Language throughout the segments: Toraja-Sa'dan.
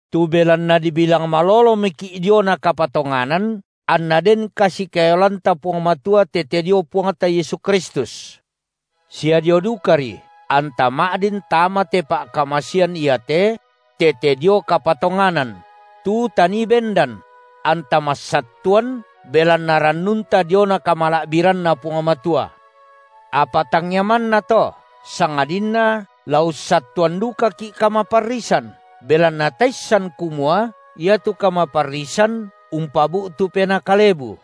Tu belanna dibilang malolomoki’ diona kapatonganan, anna den kasikaeloanta Puang Matua tete dio Puangta Yesu Kristus, sia dio dukaRi, anta ma’din tama te pa’kamasean iate (tete dio kapatonganan) tu tanii bendan; anta massattuan belanna rannunta diona kamala’biranNa Puang Matua. Apa tangia manna to, sangadinna la ussattuan dukaki’ kamaparrisan, belanna taissan kumua iatu kamaparrisan umpabu’tu penaa kalebu,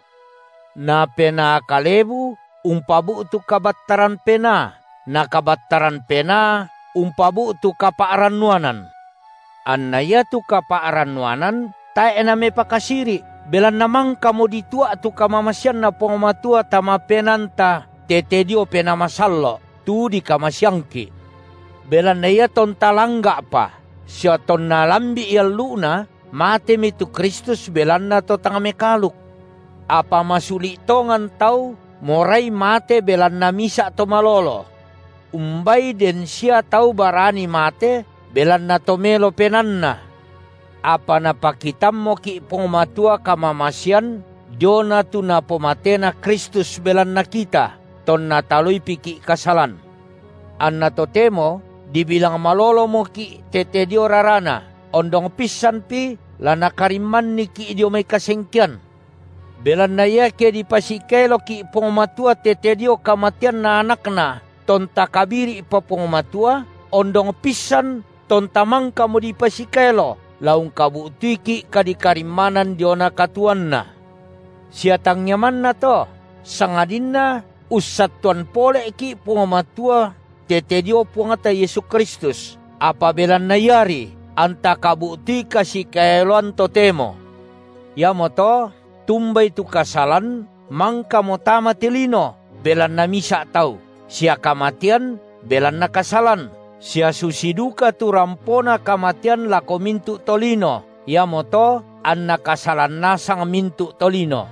na penaa kalebu umpabu’tu kabattaran penaa, na kabattaran penaa umpabu’tu kapa’rannuanan; anna iatu kapa’rannuanan tae’ namepakasiri’, belanna mangkamo ditua’ tu kamamaseanNa Puang Matua tama penaanta tete dio Penaa Masallo’ tu dikamaseangki’. Belanna iatonta langga’pa sia tonna lambi’i allu’na, matemi tu Kristus belanna to tang mekaaluk. Apa masuli’ tongan tau morai mate belanna misa’ to malolo. Umbai den sia tau barani mate belanna to melo penaanna. Apa napakitammoki’ Puang Matua kamamasean diona tu napomatena Kristus belanna kita, tonna taloipiki’ kasalan. Anna totemo dibilang malolomoki’ tete dio raraNa, ondong pissanpi la Nakarimmanniki’ dio mai kasengkean. Belanna iake dipasikaeloki’ Puang Matua tete dio kamateanNa AnakNa, tonta kabiri’pa Puang Matua, ondong pissan, tonta mangkamo dipasikaelo, la ungkabu’tuiki’ kadikarimmanan diona katuoanNa. Sia tangia manna to, sangadinna ussattuan poleki’ Puang Matua tete dio Puangta Yesu (Kristus), apa belanna Iari anta kabu’tui kasikaeloan totemo. Iamoto tumbai tu kasalan mangkamo tama te lino, belanna misa’ tau, sia kamatean belanna kasalan, sia susi duka tu rampona kamatean lako mintu’ tolino, iamoto anna kasalan nasang mintu’ tolino –,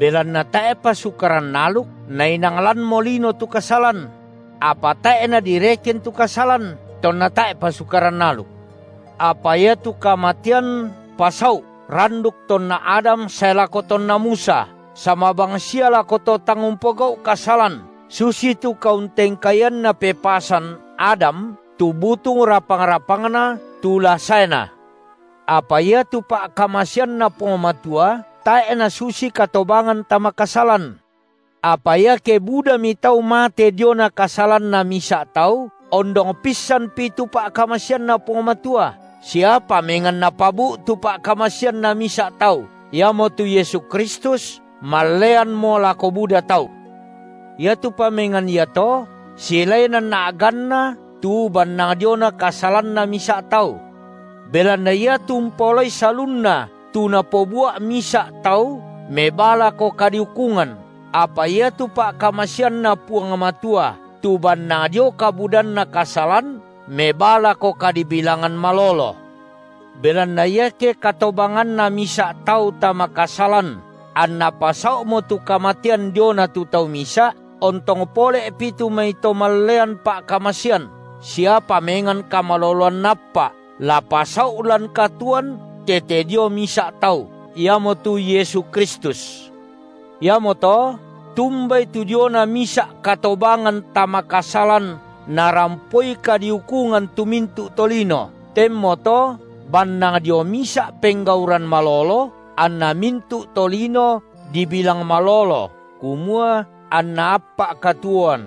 belanna tae’pa Sukaran aluk, nainang lanmo lino tu kasalan; apa tae’ nadireken tu kasalan, tonna tae’pa Sukaran aluk. Apa iatu kamatean pasau’ randuk tonna Adam sae lako tonna Musa, sama bang sia lako to tang umpogau’ kasalan susitu kauntengkaianna pepasan Adam, tu butung rapang-rapangna Tu la saena. Apa iatu pa’kamaseanNa Puang Matua tae’ nasusi katobangan tama kasalan. Apa iake budami tau mate diona kasalanna misa’ tau, ondong pissanpi tu pa’kamaseanNa Puang Matua sia pamengan napabu’tu pa’kamaseanNa misa’ Tau, iamotu Yesu Kristus malleanmo lako buda tau. Iatu pamengan iato silaenan a’ganna tu bannang diona kasalanna misa’ tau. Belanna iatu umpaolai salunna tu napobua’ misa’ tau mebaa lako kadiukungan, apa iatu pa’kamaseanNa Puang Matua tu bannang dio kabudanna kasalan mebaa lako kadibilangan malolo. Belanna iake katobanganna misa’ tau tama kasalan anna pasau’mo tu kamatean diona tu tau misa’, ontong pole’pi tu mai to mallean pa’kamasean sia pamengan kamaloloan naappa’, la pasau’ lan katuoan tete dio misa’ Tau, iamotu Yesu Kristus. Iamoto, tumbai tu diona misa’ katobangan tama kasalan narampoi kadiukungan tu mintu’ tolino, tenmoto bannang dio misa’ penggauran malolo, anna mintu’ tolino dibilang malolo kumua anna appa’ katuoan.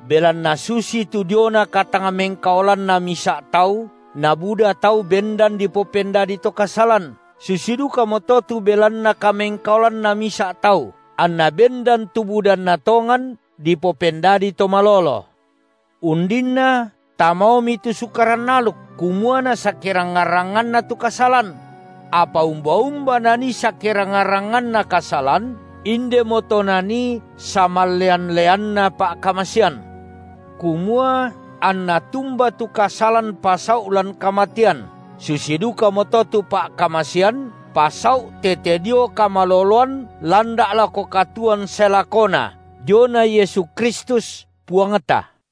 Belanna susitu diona katangmengkaolanna misa’ tau, nabuda tau bendan dipopendadi to kasalan, susi dukamoto tu belanna kamengkaolanna Misa’ Tau, anna bendan tu budanna tongan dipopendadi to malolo. Undinna tamaomi tu Sukaran aluk, kumua nasakerangngan-rangnganna tu kasalan; apa umba-umba nanii sakerangngan-rangnganna kasalan, indemoto nanii samallean-leanna pa’kamasean, kumua anna tumba tu kasalan pasau’ lan kamatean, susi dukamoto tu pa’kamasean pasau’ tete dio kamaloloan landa’ lako katuoan sae lakona diona Yesu Kristus, Puangta.